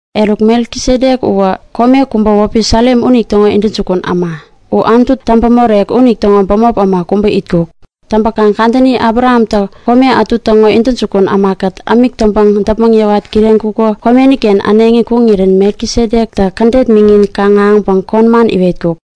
Eruk Melkisedek uwä kome kubä wäpi Salem unitäŋo intäjukun äma. U Anutu Täŋpämorek unitäŋo bämop äma kubä itkuk. Täŋpäkaŋ kadäni Abrahamtä kome ätu täŋo intäjukun ämakät ämik täŋpäŋ däpmäŋ yäwat kireŋkuko komeni-ken äneŋi kuŋirän Melkisedektä kädet miŋin kaŋ-ahäŋpäŋ kon man iwetkuk.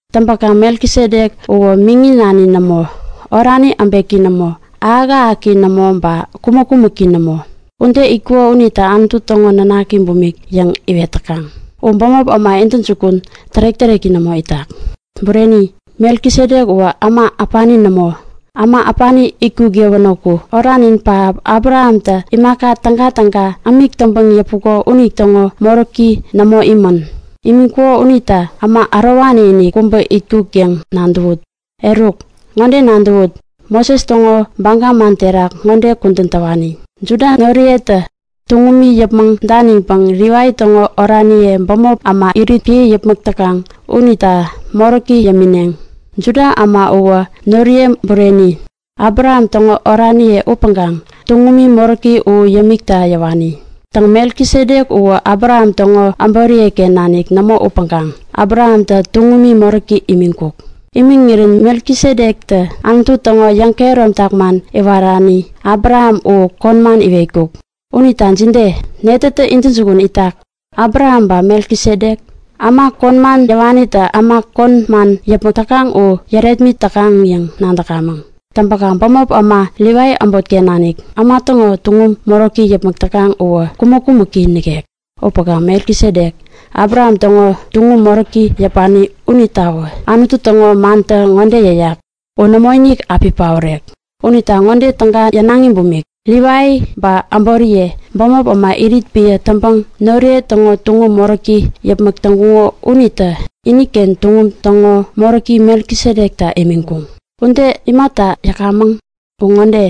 Täŋpäkaŋ Melkisedek uwä miŋi nani nämo, orani äbeki nämo, ahäk-ahäki nämo ba kumäk-kumäki nämo. Ude itkuko unita Anutu täŋo nanaki bumik yäŋ iwet täkaŋ. U bämop äma intäjukun tärek-täreki nämo itak. Bureni, Melkisedek uwä äma äpani nämo! Äma äpani itkuk yäwänäku oranin pähap Abrahamtä imaka tägatäga ämik täŋpäŋ yäpuko unitäŋo moräki nämo imän. Imiŋkuko unita äma ärowani-inik kubä itkuk yäŋ nadäwut! Eruk, ŋode nadäwut; Moses täŋo baga man terak ŋode kudän täwani; Juda noriyetä tuŋumi yäpmäŋ daniŋpäŋ Livai täŋo oraniye bämop äma irit piä yäpmäk täkaŋ unita moräki yämineŋ. Juda äma uwä noriye bureni, Abraham täŋo oraniye upäŋkaŋ tuŋumi moräki u yämikta yäwani. Täŋ, Melkisedek uwä Abraham täŋo äboriye-ken nanik nämo upäŋkaŋ Abrahamtä tuŋumi moräki imiŋkuk. Imiŋirän Melkisedektä Anutu täŋo yäŋkehäromtak man iwerani Abraham u kon man iwetkuk. Unita jide? Netätä intäjukun itak, Abraham ba Melkisedek? Äma kon man yäwanitä äma kon man yäpmäk täkaŋ u yärepmit täkaŋ yäŋ nadäkamäŋ. Täŋpäkaŋ bämop äma Livai äbotken nanik, äma täŋo tuŋum moräki yäpmäk täkaŋ uwä kumäk-kumäki nikek. Upäŋkaŋ Melkisedek, Abraham täŋo tuŋum moräki yäpani unitawä Anutu täŋo mantä ŋode yäyak; U nämoinik api paorek. Unita ŋode täga yänaŋi bumik; Livai ba äboriye, bämop äma irit piä täŋpäŋ noriye täŋo tuŋum moräki yäpmäk täŋkuŋo unitä iniken tuŋum täŋo moräki Melkisedekta imiŋkuŋ. Ude imata yäkamäŋ? U ŋode;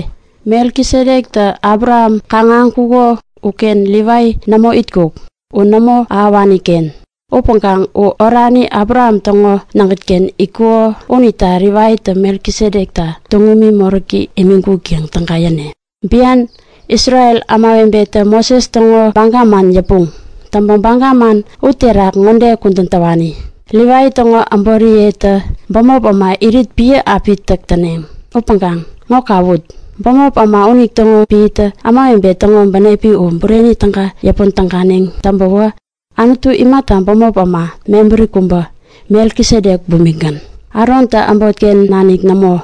Melkisedektä Abraham kaŋ-ahäŋkuko uken Livai nämo itkuk. U nämo ahäwani-ken. Upäŋkaŋ u orani Abraham täŋo nägät-ken itkuko unita Livaitä Melkisedekta tuŋumi moräki imiŋkuk yäŋ täga yäne. Bian Isrel ämawebetä Moses täŋo baga man yäpuŋ. Täŋpäŋ baga man uterak ŋode kudän täwani; Livai täŋo äboriyetä bämop äma irit piä api täk täneŋ. Upäŋkaŋ, ŋo kawut! Bämop äma unitäŋo piätä ämawebe täŋo bänepi u bureni täga yäpän täganeŋ täŋpäwä, Anutu imata bämop äma mebäri kubä, Melkisedek bumikgän, Arontä äbotken nanik nämo,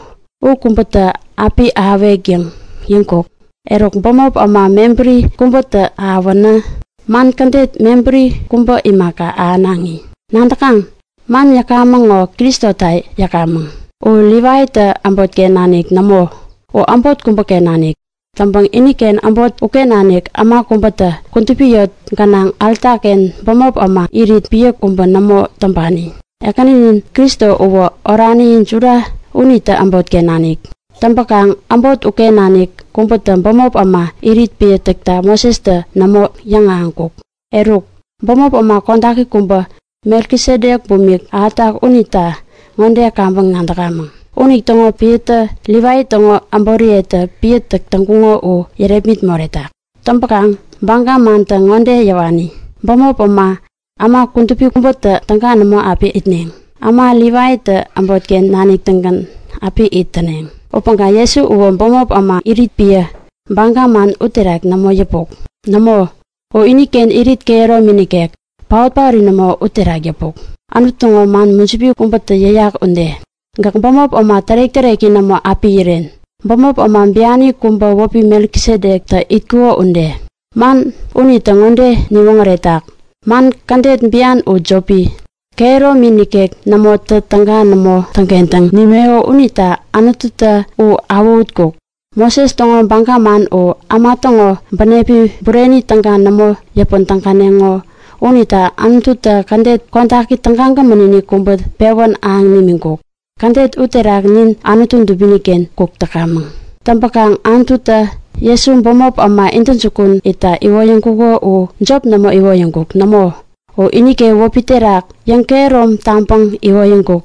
u kubätä api ahäwek yäŋ yäŋkuk? Eruk bämop äma mebäri kubätä ahäwänä, man kädet mebäri kubä imaka, ahänaŋi. Nadäkaŋ? Man yäkamäŋ ŋo Kristota yäkamäŋ. U Livaitä äbotken nanik nämo, u äbot kubäken nanik. Täŋpäŋ iniken äbot uken nanik äma kubätä kudupi yot gänaŋ alta-ken bämop äma irit piä kubä nämo täŋpani. Ekäninin Kristo uwä orani Juda unitä äbotken nanik. Täŋpäkaŋ äbot uken nanik kubätä bämop äma irit piä täkta Mosestä nämo yäŋahäŋkuk. Eruk, bämop äma kodaki kubä, Melkisedek bumik ahätak unita ŋode kaŋpäŋ nadäkamäŋ; Unitäŋo piätä Livai täŋo äboriyetä piä täk täŋkuŋo u yärepmit moretak. Täŋpäkaŋ baga mantä ŋode yäwani; Bämop äma, äma kudupi kubätä täga nämo api itneŋ, äma Livaitä äbotken nanik-tägän api it täneŋ. Upäŋkaŋ Jesu uwä bämop äma irit piä, baga man uterak nämo yäpuk. Nämo, u iniken irit kehäromini nikek, paot-paori nämo uterak yäpuk. Anutu täŋo man mujipi kubätä yäyak ude; Gäk bämop äma tärek-täreki nämo api iren, bämop äma biani kubä wäpi Melkisedektä itkuko ude. Man unitä ŋode niwoŋäretak; Man kädet biani u jopi, kehäromi nikek nämotä täga nämo täŋkentäŋ nimeko unita Anututä u awähutkuk. Moses täŋo baga man u äma täŋo bänepi bureni täga nämo yäpän täganeŋo unita Anututä kädet kodaki tägagämän-inik kubä pewän ahäŋ nimiŋkuk. Kädet uterak nin Anutu dubini-ken kuk täkamäŋ. Täŋpäkaŋ Anututä Jesu bämop äma intäjukun itta iwoyäŋkuko uwä jop nämo iwoyäŋkuk. Nämo, u iniken wäpi terak yäŋkehärom taŋpäŋ iwoyäŋkuk.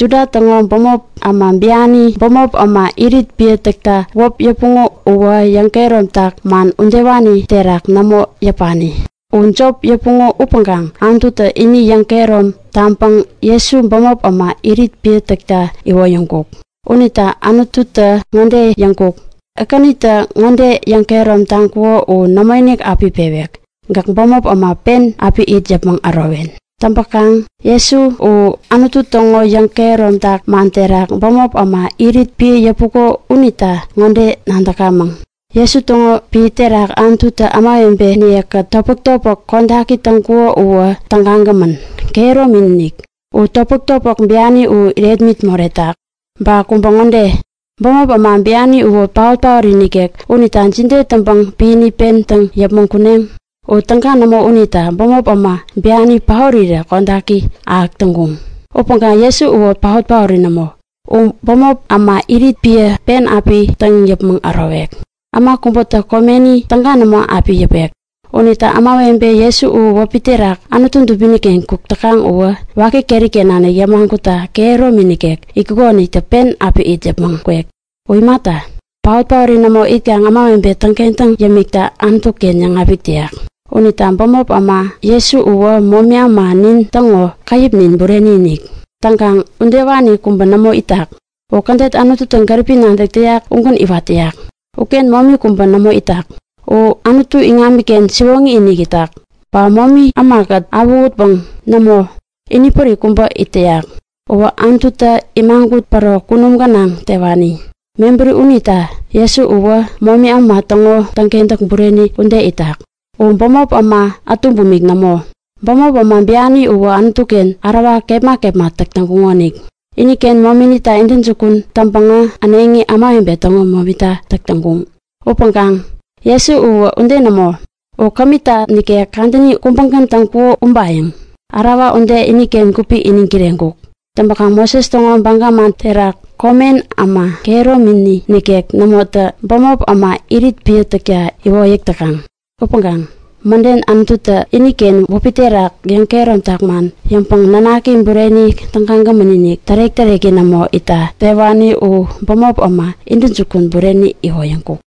Juda täŋo bämop äma biani bämop äma irit piä täkta wäp yäpuŋo uwä yäŋkehäromtak man udewani terak nämo yäpani. U jop yäpuŋo upäŋkaŋ Anututä ini yäŋkehärom taŋpäŋ Jesu bämop äma irit piä täkta iwoyäŋkuk. Unita Anututä ŋode yäŋkuk; Ekänitä ŋode yäŋkehärom taŋkuko u nämoinik api pewek; Gäk bämop äma pen api it yäpmäŋ ärowen. Täŋpäkaŋ Jesu u Anutu täŋo yäŋkehäromtak man terak bämop äma irit piä yäpuko unita ŋode nadäkamäŋ; Jesu täŋo piä terak Anututä ämawebeniye-kät topmäk-topmäk kodaki täŋkuko uwä tägagämän, kehäromi-inik. U topmäk-topmäk biani u irepmit moretak. Ba kubä ŋode; Bämop äma biani uwä paot-paori nikek unita jide täŋpäŋ piäni pen täŋ yäpmäŋ kuneŋ? U täga nämo unita bämop äma biani paorirä kodaki ahäk täŋkuŋ. Upäŋkaŋ Jesu uwä paot-paori nämo, u bämop äma irit piä pen api täŋ yäpmäŋ ärowek. Äma kubätä komeni täga nämo api yäpek. Unita ämawebe Jesu u wäpi terak Anutu dubini-ken kuk täkaŋ uwä waki keri-ken nanik yämagutta kehäromi nikek itkukonitä pen api it yäpmäŋ kwek. U imata, paot-paori nämo itkaŋ ämawebe täŋkentäŋ yämikta Anutu-ken yäŋapik täyak. Unita bämop äma Jesu uwä momi äma nin täŋo käyäpnin bureni-inik. Täŋkaŋ udewani kubä nämo itak. U kädet Anututä gäripi nadäk täyak ugän iwat täyak. Uken momi kubä nämo itak. U Anutu iŋamiken siwoŋi-inik itak. Ba momi ämakät awähutpäŋ nämo, inipärik kubä it täyak. Uwä Anututä imagut päro kunum gänaŋ tewani. Mebäri unita Jesu uwä momi äma täŋo täŋkentäk bureni ude itak. U bämop äma ätu bumik nämo. Bämop äma biani uwä Anutu-ken ärawa kepma kepma täk täŋkuŋonik. Iniken momita intäjukun täŋpäŋä äneŋi ämawebe täŋo momita täk täŋkuŋ. Upäŋkaŋ Jesu uwä ude nämo täŋkuk. U kämita nikek kadäni kubägän täŋkuko ubayäŋ. Ärawa ude iniken gupi iniŋ kireŋkuk. Täŋpäkaŋ Moses täŋo baga man terak komen äma kehäromini nikek nämotä bämop äma irit piä täkta iwoyäk täkaŋ. Upäŋkaŋ, mäden Anututä iniken wäpi terak yäŋkehäromtak man yäŋpäŋ Nanaki bureni tägagämän-inik tärek-täreki nämo itta tewani u bämop äma intäjukun bureni iwoyäŋkuk.